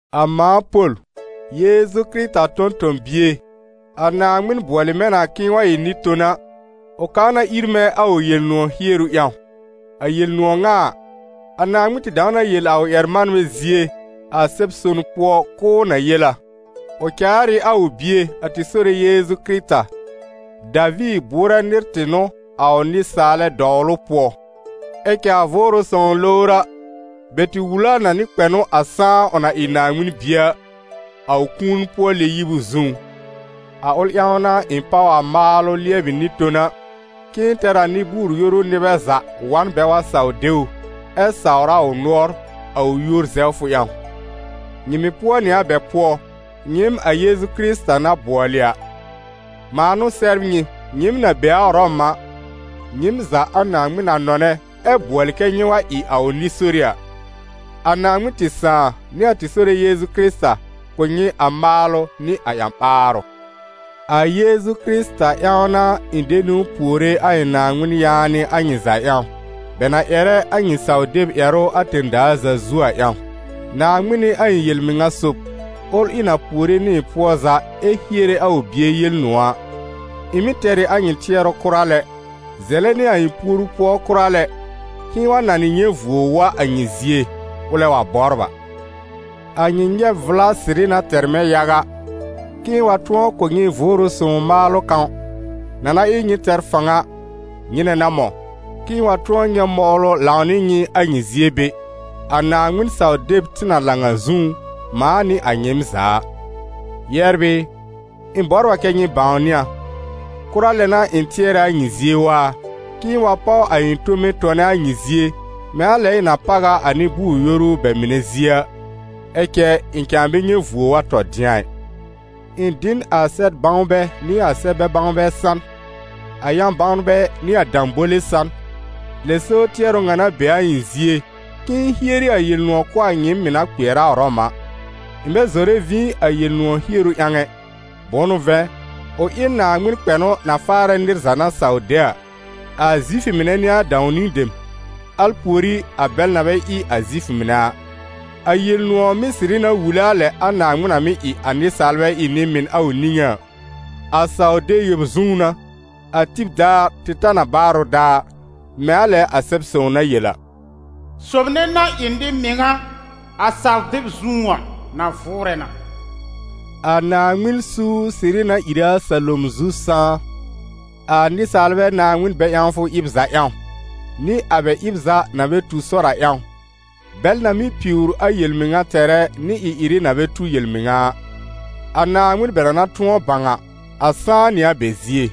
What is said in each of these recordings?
A mãa Pol, Yeezu Kɩrɩta tõ-tõ-bie, a Naaŋmɩn bʋɔlɩ mɛ̃ na k'ɩ̃ɩ wa ɩ nɩ-tona, ʋ kaa na ir mɛ̃ a ʋ Yel-nʋ̃ɔ̀ hieru ƴãw. A Yel-nʋ̃ɔ̀ ŋa a, a Naaŋmɩn tɩ dãw na yel a ʋ ƴɛr-manbɛ zie, a Sɛb-son pʋɔ, k'ʋʋ na yel a. Ʋ caar ɩ a ʋ Bie, a tɩ Sore Yeezu Kɩrɩta: Daviir bʋʋrɛ nɩr tɩ n'ʋ a ʋ nɩsaalɛ dɔwlʋ pʋɔ; ɛ cɛ a Vʋʋrʋ Sõw lowr a, bɛ tɩ wul a nɩ kpɛnʋ a sãá ʋ na ɩ Naaŋmɩn Bie a, a ʋ kũuni-pʋɔ-lɛ-yib zũú. A ʋl ƴãw n'a ɩ̃ páw a maalʋ lɩɛbɩ nɩ-tona, k'ɩ̃ɩ tɛr a nɩ-bʋʋ-yoru nɩbɛ za wa n bɛ wa saw de ʋ, ɛ sawr a ʋ nʋɔr, a ʋ yúor zɛwfʋ ƴãw. Nyɩ mɩ̀ pʋɔ nɩ a bɛ pʋɔ, nyɩɩm a Yeezu Kɩrɩta na bʋɔlɩ a. Mãa n'ʋ sɛbr nyɩ, nyɩɩm na be a Ʋrɔm a, nyɩɩm za a Naaŋmɩn na nɔnɛ ɛ bʋɔlɩ kɛ́ nyɩ wa ɩ a ʋ nɩ-sori a. A Naaŋmɩn tɩ Sãà nɩ a tɩ Sore Yeezu Kɩrɩta kʋ̀ nyɩ a maalʋ nɩ a ƴã-ɓaarʋ. A Yeezu Kɩrɩta ƴãw n'a ɩ̃ de niwn puore a ɩ̃ Naaŋmɩn yaanɩ a nyɩ za ƴãw, bɛ na ƴɛrɛ a nyɩ saw-deb ƴɛrʋ a tẽ-daa za zu a ƴãw. Naaŋmɩn n'ɩ a ɩ̃ yel-mɩŋa sob, ʋl ɩ̃ na puore nɩ ɩ̃ pʋɔ za ɛ hiere a ʋ Bie Yel-nʋ̃ɔ̀ a. Ɩ̃ mɩ́ tɛr ɩ a nyɩ tɩɛrʋ kʋra lɛ, zɛlɛ nɩ a ɩ̃ puoru pʋɔ kʋra lɛ, k'ɩ̃ɩ wa nanɩ nyɛ̃ vuo wa a nyɩ zie, ʋlɛ wa bɔbr a. A nyɩ nyɛb vʋla sɩrɩ na tɛr mɛ̃ yaga, k'ɩ̃ɩ wa tʋ̃ɔ kʋ̀ nyɩ Vʋʋrʋ Sõw maalʋ kãw, na na ɩ nyɩ tɛr fãw a, nyɩnɛ n'a mɔ̃, k'ɩ̃ɩ wa tʋ̃ɔ nyɛ̃ mɔwlʋ lãw nɩ nyɩ a nyɩ zie be, a Naaŋmɩn-saw-deb tɩ na lãw a zũú, mãa nɩ a nyɩɩm za a. Yɛbr ɩ, ɩ̃ bɔbr a kɛ́ nyɩ bãwnɩ a, kʋra lɛ n'a ɩ̃ tɩɛrɛ a nyɩ zie waa, k'ɩ̃ɩ wa páw a ɩ̃ tome tɔnɛ a nyɩ zie, mɛ̃ a lɛ ɩ̃ na páw a a nɩ-bʋʋ-yoru bɛ mɩnɛ zie a, ɛ cɛ ɩ̃ cãa bɛ nyɛ̃ vuo wa tɔ dɩ̃a ɩ. Ɩ̃ dɩ n a sɛb-bãwnbɛ nɩ a sɛb-bɛ-bãwnbɛ san, a yã-bãwnbɛ nɩ a dãbole san. Lɛ so tɩɛrʋ ŋa na be a ɩ̃ zie, k'ɩ̃ɩ hieri a Yel-nʋ̃ɔ̀ kʋ̀ a nyɩɩm mɩ̀ na kpɩɛr a Ʋrɔm a. Ɩ̃ bɛ zɔrɛ vĩ a Yel-nʋ̃ɔ̀ hieru ƴãw ɛ: bʋ̃ʋ n'ʋ vɛ̃, ʋ ɩ n Naaŋmɩn kpɛnʋ na faarɛ nɩr za na saw de a, a Zifʋ mɩnɛ n'ɩ a dãw-niwn dem, al pùorí a bɛl na bɛ ɩ Zifʋ mɩnɛ a. A Yel-nʋ̃ɔ̀ mɩ́ sɩrɩ na wule a lɛ a Naaŋmɩn na mɩ́ ɩ a nɩsaalbɛ ɩ nɩ-mɩn a ʋ niŋé a: a saw-deb yõ zũú n'a, a tib daar tɩ ta n a baarʋ daar, mɛ̃ a lɛ a Sɛb-sõw na yel a: «Sob nɛ na ɩ nɩ-mɩŋa, a saw-deb zũú a, na vʋʋrɛ na.» A Naaŋmɩn suur sɩrɩ na ìre a salom zu sãá, a nɩsaalbɛ Naaŋmɩn-bɛ-ƴãwfʋ ɩb za ƴãw, nɩ a bɛ ɩb za na bɛ tu sɔr a ƴãw, bɛl na mɩ́ piwr a yel-mɩŋa tɛrɛ nɩ ɩ-ɩrɩ na bɛ tu yel-mɩŋa a. A Naaŋmɩn bɛ na na tʋ̃ɔ bãw a, a sãá nɩ a bɛ zie: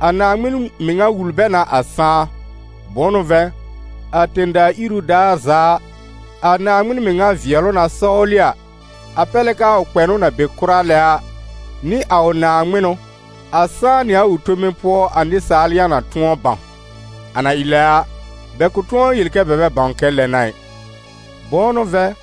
a Naaŋmɩn mɩŋa wul bɛ na a sãá. Bʋ̃ʋ n'ʋ vɛ̃, a tẽ-daa iru daar za a, a Naaŋmɩn mɩŋa vɩɛlʋ na sɔwlɩ a, a pɛr lɛ k'aa ʋ kpɛnʋ na be kʋra lɛ a, nɩ a ʋ naaŋmɩnʋ, a sãá nɩ a ʋ tome pʋɔ a nɩsaal yã na tʋ̃ɔ bãw. A na ɩ lɛ a, bɛ kʋ̃ tʋ̃ɔ yel kɛ bɛ bɛ bãw kɛ lɛ n'a ɩ. Bʋ̃ʋ n'ʋ vɛ̃,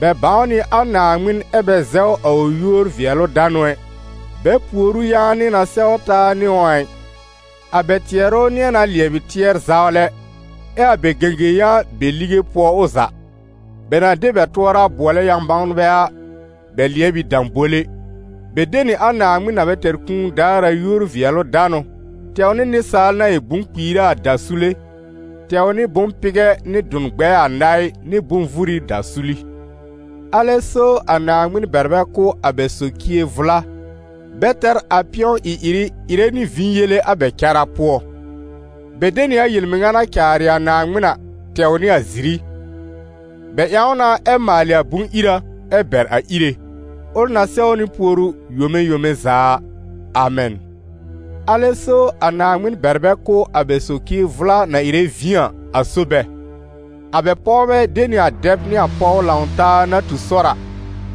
bɛ bãw nɩ a Naaŋmɩn ɛ́ bɛ zɛw a ʋ yúor-vɩɛlʋ-danʋ ɛ, bɛ pùor ʋ yaanɩ na sɛw taa nɩ ʋ a ɩ. A bɛ tɩɛrʋ nɩ̃ɛ na lɩɛbɩ tɩɛr-zawlɛ, ɛ́ a bɛ gẽgẽ-yã be lige pʋɔ ʋ za. Bɛ na de bɛ tʋɔra bʋɔlɛ yã-bãwnbɛ a, bɛ lɩɛb ɩ dãbole; bɛ de nɩ a Naaŋmɩn na bɛ tɛr kũu daar a yúor-vɩɛlʋ-danʋ tɛw nɩ nɩsaal na ɩ bʋ̃-kpiira a dasule, tɛw nɩ bʋ̃-pɩgɛ nɩ dʋ̃-gbɛɛ-anaɩ nɩ bʋ̃-vuri dasuli. Alɛ so a Naaŋmɩn bɛr bɛ kʋ̀ a bɛ socie vʋla, bɛ tɛr a pɩ̃ɔ ɩ-ɩrɩ ɩrɛ nɩ vĩ yele a bɛ cara pʋɔ. Bɛ de nɩ a yel-mɩŋa na caarɩ a Naaŋmɩn a, tɛw nɩ a ziri; bɛ ƴãw na ɛ maalɩ a bʋ̃-ira, ɛ́ bɛr a Íre, ʋl na sɛwnɩ puoru yome yome za a! Amɛn. Alɛ so a Naaŋmɩn bɛr bɛ kʋ̀ a bɛ socie vʋla na ɩrɛ vĩ a, a so bɛ. A bɛ pɔwbɛ de nɩ a dɛb nɩ pɔw lãw-taa na tu sɔr a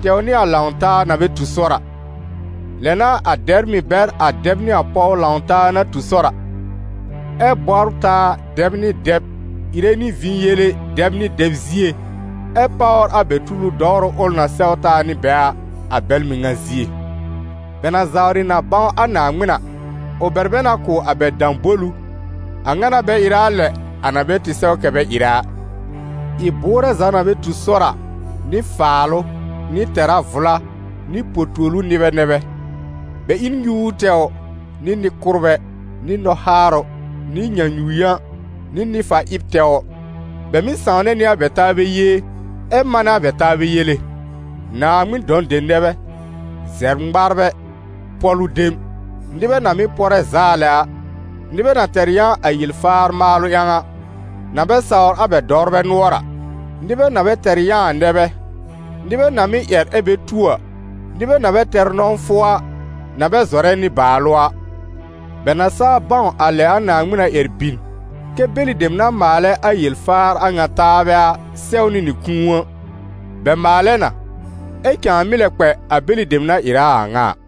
tɛw nɩ a lãw-taa na bɛ tu sɔr a. Lɛ n'a a dɛbr mɩ̀ bɛr a dɛb nɩ a pɔw lãw-taa na tu sɔr a, ɛ bɔbr taa dɛb nɩ dɛb, ɩrɛ nɩ vĩ yele dɛb nɩ dɛb zie, ɛ́ páwr a bɛ tulu dɔwrʋ ʋl na sɛw taa nɩ bɛ a, a bɛl mɩŋa zie. Bɛ na zawrɩ na bãw a Naaŋmɩn a, ʋ bɛr bɛ na kʋ̀ a bɛ dãbolu, a ŋa n'a bɛ ɩrɛ a lɛ a na bɛ tɩ sɛw kɛ bɛ ɩrɛ a. Ɩ-bʋʋrɛ za na bɛ tu sɔr a, nɩ faalʋ, nɩ tɛra vʋla, nɩ po-tuolu nɩbɛ nɛ bɛ; bɛ ɩ n nyuur tɛwr, nɩ nɩ-kʋ́rbɛ, nɩ nɔhaarʋ, nɩ nyãnyu-yã, nɩ nɩ-fa-ɩb tɛwr. Bɛ mɩ́ sãwnɛ nɩ a bɛ taabɛ yee, ɛ́ manɛ a bɛ taabɛ yele; Naaŋmɩn dɔ̃ dem nɛ bɛ, zɛbr-ŋmaarbɛ, pɔ̀lʋ dem, nɩbɛ na mɩ́ pɔrɛ zaa lɛ a, nɩbɛ na tɛr yã a yel-faar maalʋ ƴãw a, na bɛ sawr a bɛ dɔwrbɛ nʋɔr a. Nɩbɛ na bɛ tɛr yã a nɛ bɛ, nɩbɛ na mɩ́ ƴɛr ɛ bɛ tu a, nɩbɛ na bɛ tɛr nɔ̃wfʋ a, na bɛ zɔrɛ nɩ-baalʋ a. Bɛ na saa bãw a lɛ a Naaŋmɩn na ƴɛr bin, kɛ́ bɛlɩ dem na maalɛ a yel-faar a ŋa taabɛ a, sɛwnɩ nɩ kũu a, bɛ maalɛ na, ɛ cãa mɩ́ lɛ kpɛ a bɛlɩ dem na ɩrɛ a a ŋa a.